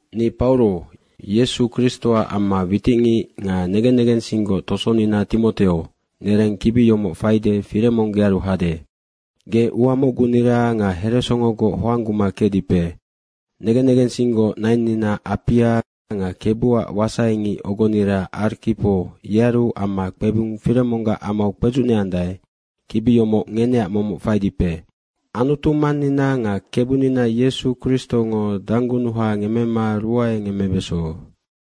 Ni Pauro Yesu Kristoac amma witicngic nga negen negensinggoc tosonina Timoteo, nereng kibi yomoc faide Firemong gearu hade. Ge ua mocgunira nga heresongogoc hoangguma kecdipe. Negen negensinggoc nainnina Apia nga Kebuac wasaingic ogonira Arkipo yearu amma kpebung Firemonggac amau kpedzucneandae, kibi yomoc ngeneac momoc faidipe. Anutu Mannina nga Kebunina Yesu Kristongo danggunuha ngemmema ruae ngemmebeso.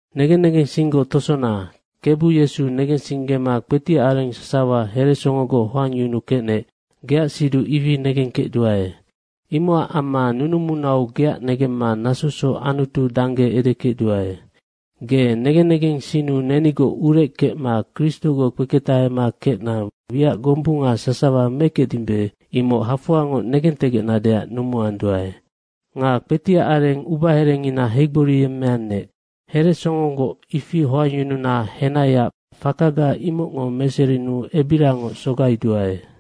Negen negensinggoc tosona, Kebu Yesu negensinggema kpetiac areng sasawa heresongogoc hoangyunukecnec, geac siduc ifi negengkecduae. Imocac amma nunumunau geac negemma nasosoc Anutu dangge edekecduae. Ge negen negensinnu nenigoc urec kecma Kristogoc kpeketahema kecna wiac gombunga sasawa mekecdimbe, imoc hafoangoc negentegecnadeac numuanduae. Nga kpetiac areng ubaherengina heigboriyemmeannec. Heresongogoc ifi hoangyununa henaiac fakaga imocngo meserinuu ebiriangoc sogaiduae.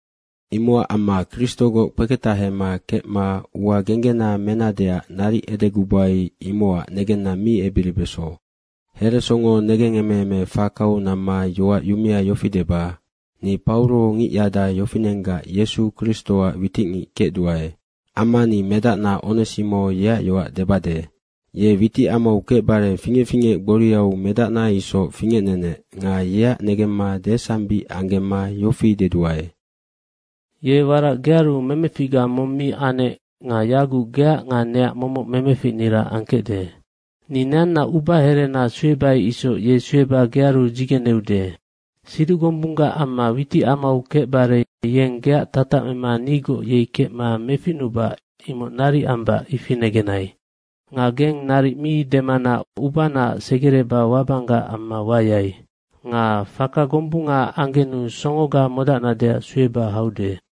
Imocac amma Kristogoc kpeketahema kecma ua genggena menadeac naric edegubai, imocac negenna mi ebiribeso. Heresongo negengemeeme fakau namma yoac yumea yofi deba, ni Pauro ngicyada yofinenggac Yesu Kristoac witicngic kecduae. Amma ni medacna Onesimo yeac yoac debade. Ye witicamau kecbare fingec fingec gboriau medacna isoc fingecnenec nga yeac negemma desambic anggemma yofi deduae, Ye warac gearu memeficga mong mi anec nga yaguc geac nga neac momoc memeficnira angkecde. Ni neanna ubaherena suebai isoc ye sueba gearu dzigeneude. Siduc gombunggac amma witicamau kecbare yeng geac tatac mema nigoc yei kecma meficnubac, imoc naric ambac ifi negenai. Nga geng naric mi demana ubanaac segereba wabanggac amma wayai. Nga faka gombungaac anggenu songoga modacnadeac sueba haude.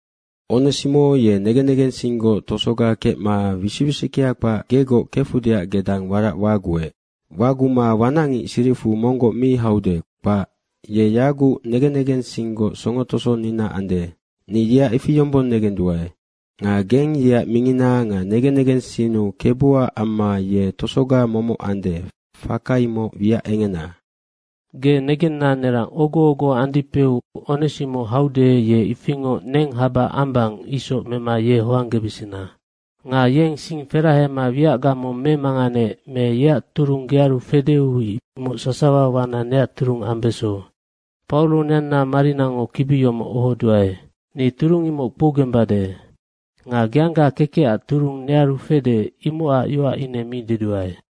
Onesimo ye negen negensinggoc tosoga kecma wisic wisickea kpac gegoc kefudeac gedang warac waguec. Waguma wanacngic siricfu monggoc mi haude, kpac. Ye yaguc negen negensinggoc songo tosonina ande. Ni yeac ifi yombong negenduae. Nga geng yeac mingina nga negen negensinnu Kebuac amma ye tosoga momoc ande, faka imoc wiac engena. Ge negenna nerang ogo ogo andipeu Onesimo haude, ye ifingoc neng haba ambang isoc mema ye hoanggebesena. Nga yeng sing ferahema wiacga mong memanganeec me yeac turung gearu fedeu imoc sasawa wana neac turung ambeso. Pauro neanna marinango kibi yomoc ohoduae. Ni turung imoc kpougembade. Nga geangga kekecac turung nearu fede, imocac yoac ine mi deduae.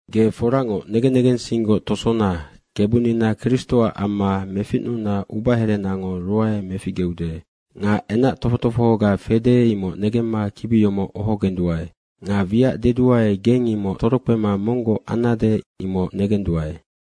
Ge foracngoc negen negensinggoc tosona, Kebunina Kristoac amma meficnuna ubaherenango ruae meficgeude. Nga enac tofoc tofohoga fede, imoc negemma kibi yomoc ohogenduae. Nga wiac deduae, geng imoc torokpema monggoc annade, imoc negenduae.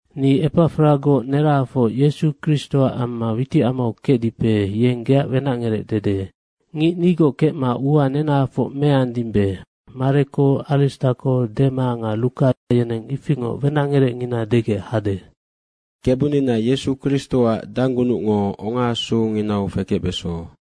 Ni Epafragoc nerahafoc Yesu Kristoac amma witicamau kecdipe, yeng geac wenacngerec dede. Ngic nigoc kecma ua nenahafoc meandimbe Mareko, Aristako, Dema nga Ruka yeneng ifingoc wenacngerecngina degec hade. Kebunina Yesu Kristoac danggunucngo ongaasunginau fekecbeso.